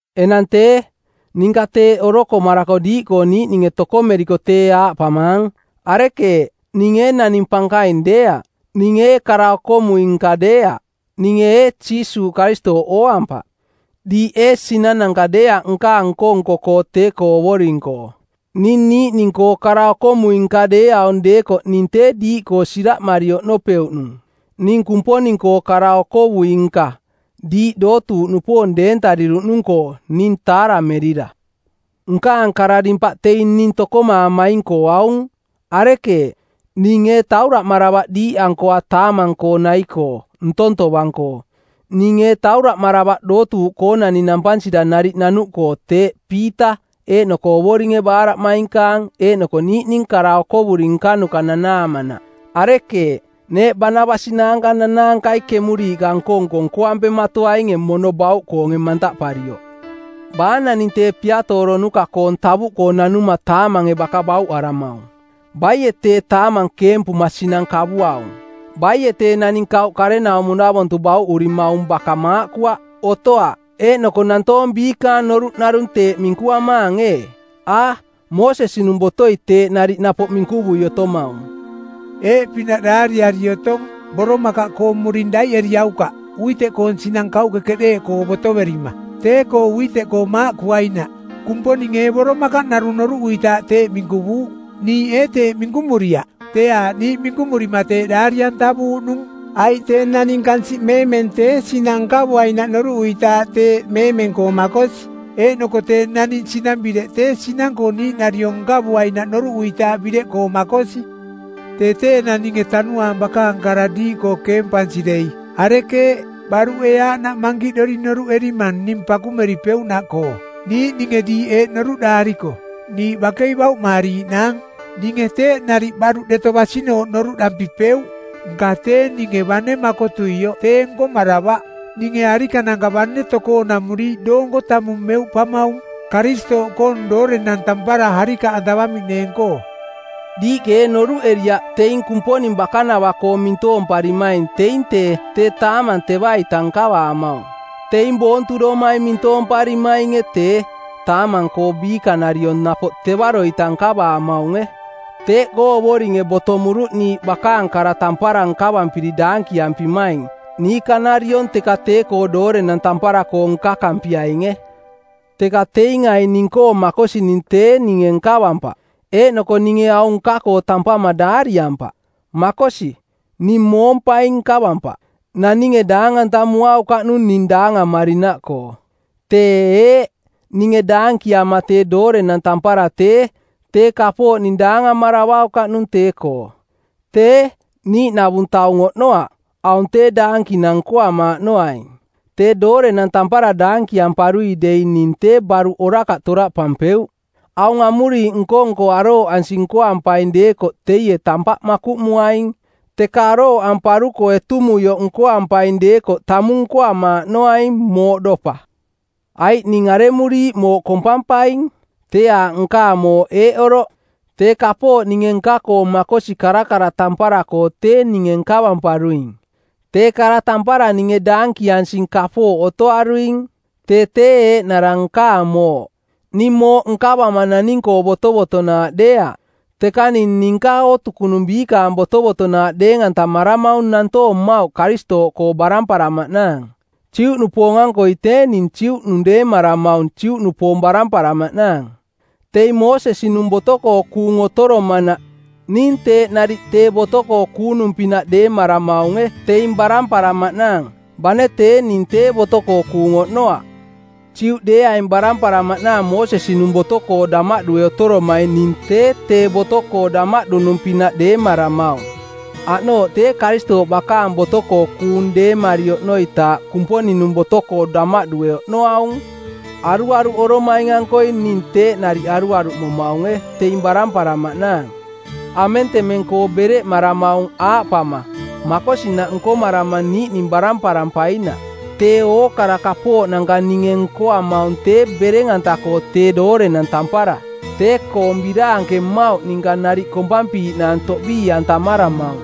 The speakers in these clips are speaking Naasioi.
Enang tee, ninka teeꞌ orokomarako diiꞌkoo niiꞌninge tokomeriko tee aaꞌpamaang: Arekeeꞌ, ning ee naning pankaing deeaꞌ? Ning ee kara-okomui-nka deeaꞌ? Ninge ee Jiisuuꞌ Karistooꞌ ooampaꞌ? Diiꞌ ee sinananka deeaꞌ nkaang nko-nko-koo tee-koo Ovoring-koo? Ning niiꞌning-koo kara-okomui-nka deeaung deekoꞌ ning tee diiꞌkoo siraꞌmari oꞌnopeuꞌnung ning Kumponing-koo kara-okovui-nka, diiꞌ dootuuꞌnupoong deentariruꞌnung-koo, ning taaramerira. Nkaang kara-dimpaꞌ teing ning tokomaamaing-koo aung: Arekeeꞌ? Ning ee tauraꞌmaravaꞌ diiꞌankoa taamang-koo nai-koo ntong tovang-koo? Ning ee tauraꞌmaravaꞌ dootuuꞌkoonani nampansira nariꞌ nanuꞌkoo teeꞌ Piita, eeꞌnoko Ovoringe baaraꞌmainkaang eeꞌnoko niiꞌning kara okovuri nkanuka nanaamanaꞌ? Arekeeꞌ, neeꞌ Baanabas naanka nanaankai kemuriiꞌka nko-nko nkoampematoainge mono bauꞌkoonge mantaꞌparioꞌ? Baa naning tee piatooronuka˜koong tavuꞌkoo nanuma taamange baka bauꞌaramaung? Baie tee taamang keempuma sinang nkavuaung? Baie tee naning kauꞌkarenaumo-navontu bauꞌurimaung baka maaꞌkuaꞌ? Otoaꞌ. Eeꞌnoko nantoong biikaang noruꞌ narung teeꞌ minkuamaang ee? A, Moosesi-nung botoi teeꞌ nariꞌ napoꞌ minkuvui otomaung. Eeꞌpinaꞌ daariari otong, “Boromakaꞌkoong muring daiꞌeriaukaꞌ uiteꞌkoong˜ sinang kauꞌke keꞌdeeꞌkoo botoverima, tee-koo uiteꞌkoo maaꞌkuainaꞌ.” Kumponinge ee boromakaꞌ narung noruꞌuitaaꞌ teeꞌ minkuvuuꞌ? Niiꞌ ee teeꞌ minkumuriaꞌ? Tee aaꞌ niiꞌ minkumurima teeꞌ daari-antavuuꞌnung. Aiꞌ tee naning kansiꞌmeemeng tee sinang nkavuainaꞌ noruꞌuitaaꞌ teeꞌ meemeng-koo makosi. Eeꞌnoko tee naning sinang-bireꞌ tee sinang-koo niiꞌnariong nkavuainaꞌ noruꞌuitaaꞌ bireꞌkoo makosi. Tee tee enang ninge Tanuaang bakaang kara diiꞌkoo keempansi dei, arekeeꞌ, baruꞌ ee aaꞌnaꞌ mankiꞌdori noruꞌerimang ning pakumeripeuꞌnaꞌkoo? Niiꞌninge diiꞌ eeꞌ noruꞌdaariko, “Niiꞌ bakei bauꞌmaariiꞌnaang,” ninge teeꞌ nariꞌ baruꞌ deto basinooꞌ noruꞌdampipeuꞌ. Nka tee ninge bane makotuioꞌ tee nkomaravaꞌ. Ninge arikananka bane tokoonamuriiꞌ doonko tamung meuꞌpamaung Karistooꞌkoong doorenang tampara arikaꞌantavamiꞌneeng-koo. Diiꞌke ee noruꞌeriaꞌ teing Kumponing bakanava-koo mintoomparimaing teing tee, tee taamang teva-ita nkavamaung? Teing boontudomai mintoomparimainge tee, taamang-koo biikanariong napoꞌ tevaro-ita nkavaamaunge. Teeꞌkoo Ovoringe botomuruꞌ niiꞌ bakaang kara tampara nkavampiri daankiampimaing niikanariong teka tee-koo doorenang tampara-koo nkakampiainge. Teka teing aing ning-koo makosining tee ninge nkavampaꞌ, eeꞌnoko ninge aung nka-koo tampama daariampaꞌ. Makosi, ning moompaing nkavampaꞌ. Naninge daang-antamuaukaꞌnung ning daangamarinaꞌkoo. Tee, eeꞌ: Ninge daankiama tee doorenang tampara tee, tee kapooꞌ ning daangamaravaukaꞌnung tee-koo. Tee, niiꞌnavung taung oꞌnoaꞌ, aung tee daankinang nkoamaaꞌnoaing. Tee doorenang tampara daankiamparui dei ning tee baruꞌ orakaꞌ toraꞌpampeuꞌ. Aung amuriiꞌ nko-nko arooꞌansi nkoampaing deekoꞌ teie tampaꞌ makuꞌmuaing, teka arooꞌamparuko etumuioꞌ nkoampaing deekoꞌ tamung nkoamaaꞌnoaing mooꞌdopa. Aiꞌ ning aremuriiꞌ mooꞌ kompampaing? Tee aaꞌ nkaang mooꞌ eeꞌ oroꞌ: tee kapooꞌ ninge nka-koo makosi karakara tampara-koo tee ninge nkavamparuing. Tee kara tampara ninge daankiansing kapooꞌ otoaruing. Tee tee eeꞌnara nkaang mooꞌ. Ning mooꞌ nkavama naning-koo botovotonaaꞌ deeaꞌ, teka ning ninka ootukunung biikaang botovotonaaꞌ deeng-antamaramaung nantoong mmauꞌ Karistooꞌkoo baramparamaꞌnaang. Juꞌnupoong-ankoi tee ning Juꞌnung deemaramaung Juꞌnupoong baramparamaꞌnaang. Teing Moosesi-nung boto-koo kuung otoromanaꞌ ning teeꞌ nariꞌ tee boto-koo kuunung-pinaꞌ deemaramaunge teing baramparamaꞌnaang, bane tee ning tee boto-koo kuung oꞌnoaꞌ. Juꞌdeeaing baramparamaꞌnaang Moosesi-nung Boto-koo damaꞌdue otoromaing ning tee tee boto-koo damaꞌdunung-pinaꞌ deemaramaung. Aꞌnooꞌ tee Karistooꞌ bakaang boto-koo kuung deemari oꞌnoitaaꞌ Kumponing-nung boto-koo damaꞌdue oꞌnoaung. Aruaruꞌoromaing-ankoi ning teeꞌ nariꞌ aruaruꞌmomaunge teing baramparamaꞌnaang. Amentemeng-koo bereꞌmaramaung aaꞌpama, “Makosinaꞌ nkomarama niiꞌning baramparampainaꞌ.” Tee ookara kapooꞌnanka ninge nkoamaung tee bereng-anta-koo tee doorenang tampara, tee-koong biraanke mmauꞌ ninka nariꞌ kompampiiꞌnaang toꞌbii-antamaramaung.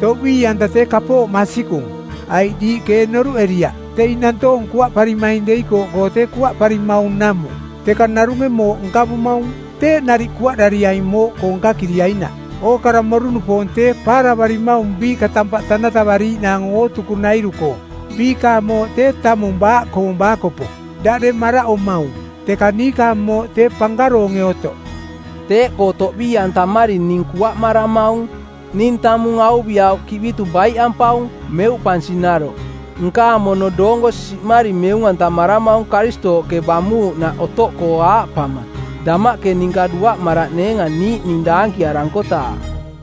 Toꞌbii-anta tee kapooꞌ masikung, aiꞌ diiꞌke ee noruꞌeriaꞌ teing nantoong kuaꞌparimaing deikooꞌkoo tee kuaꞌparimaung namuꞌ, teka narunge mooꞌ nkavumaung. Teeꞌ nariꞌ kuaꞌdariaing mooꞌkoo nkakiriainaꞌ. Ookara moru-nupoong tee paaravarimaung biiꞌka tampaꞌ tanatavariiꞌnaang ootukunairu-koo. Biikaang mooꞌ tee tamung baaꞌkoong baakopo, daꞌdeng maraꞌomaung; teka niikaang mooꞌ tee pankaroonge otoꞌ. Teeꞌkoo toꞌbii-antamari ning kuaꞌmaramaung. Ning tamung auviꞌau kiꞌbitu baiꞌampaung, meuꞌpansi naroꞌ. Nkaang mono doonko siꞌmari meung-antamaramaung Karistooꞌke bamuuꞌnaꞌ otoꞌkoo aaꞌpama, “Damaꞌke ninka duaꞌmaraꞌneenga niiꞌning daankiarankotaaꞌ.”